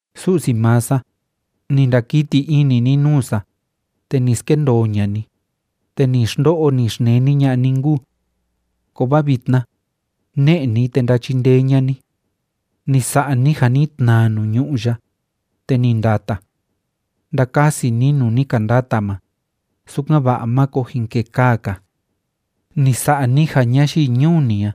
Su'si maa sa, ni ndakiti ini ni nuu sa, te ni skendoo ña'a ni, te ni xndo'o, ni xneni ña'a ni nkuu. Kovaa vitna, ne'e ni, te ndachindee ña'a ni. Ni sa'a ni ja ni tnaa nuu ñu'ú ya, te ni ndata. Ndakasi ni nuu ni ka ndata ma, sukan‑va'a máko jin kekaa‑ka. Ni sa'a ni ja ñayii ñuu ni a,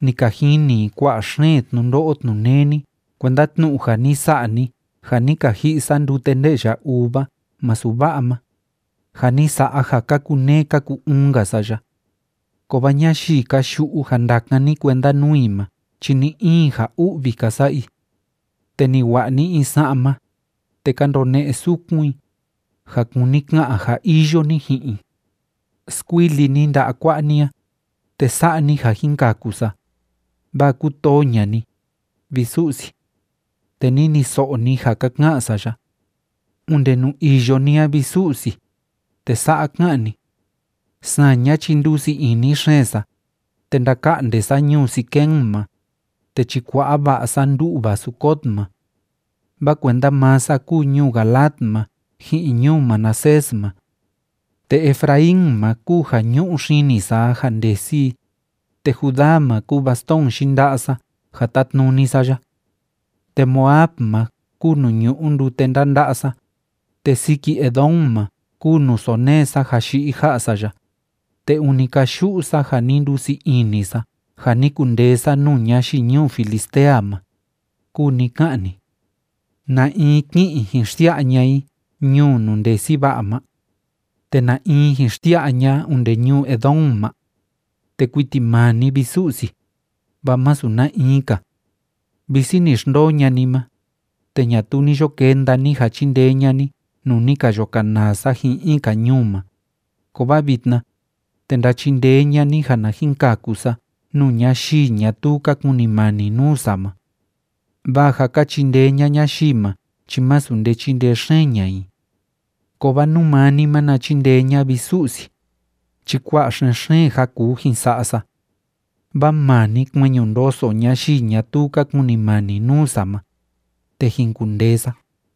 ni ka jini i kua'a xeen tnundo'o tnuneni kuenda tnu'u ja ni sa'a ni ja ni ka ji'i sa ndute nde'ya uva masu va'a ma, ja ni sa'a ja ka kuneé ka ku‑uun‑nka sa ya. Kovaa ñayii ka yu'u ja ndakan ni kuenda nuu i ma chi ni‑in ja u'vi ka sa'a i. Te ni wa'a ni in sa'ma, te ka ndone'e sukun i, ja kuni ka'an ja iyo ni ji'in i. Skuili ni nda'a kua'a ni a, te sa'a ni ja jin kaku sa, vaa kútoo ña'a ni, vi Su'si. Te niniso'o ni ja ka ka'an sa ya. Onde nuu iyo ni a, vi Su'si, te sa'a ká'an ni: “Saña chi ndusii ini xeen sa, te ndaka'nde sa ñuu Siquem ma, te chikua'a va'a sa ndu'va Sucot ma. Vaa kuenda maa sa kúu ñuu Galaad ma ji'in ñuu Manasés ma. Te Efraín ma kúu ja ñu'u xini sa a ja ndesi i, te Judá ma kúu bastón yinda'a sa ja tátnuni sa ya. Te Moab ma kúu nuu ñu'u ndute ndanda'a sa, te siki Edom ma kúu nuu sónee sa ja yi'i ja'a sa ya, te ûni káyu'u sa ja ni ndusii ini sa ja ni kundee sa nuu ñayii ñuu Filistea ma”, kúu ni ká'an ni. ¿Na in ki'in jin xsia'a ña'a i ñuu nuu ndesi va'a ma? ¿Te na in jin xsia'a ña'a onde ñuu Edom ma? Te kuiti maa ni, vi Su'si, vaa masu na in‑ka. Visi ni xndoo ña'a ni ma, te ñatuu ni yo kenda ni ja chindee ña'a ni nuu ni ka yo kanaa sa ji'in in‑ka ñuu ma, kovaa vitna, te ndachindee ña'a ni ja na jin kaku sa nuu ñayii ñatuu ka kunimani nuu sa ma. Vaa ja ka chindee ña'a ñayii ma chi masu nde chíndee xeen ña'a i. Kovaa nú maa ni na chindee ña'a, vi Su'si, chi kua'a xen‑xeen ja kuu jin sa'a sa, vaa maa ni kueñu ndoso ñayii ñatuu ka kunimani nuu sa ma, te jin kundee sa.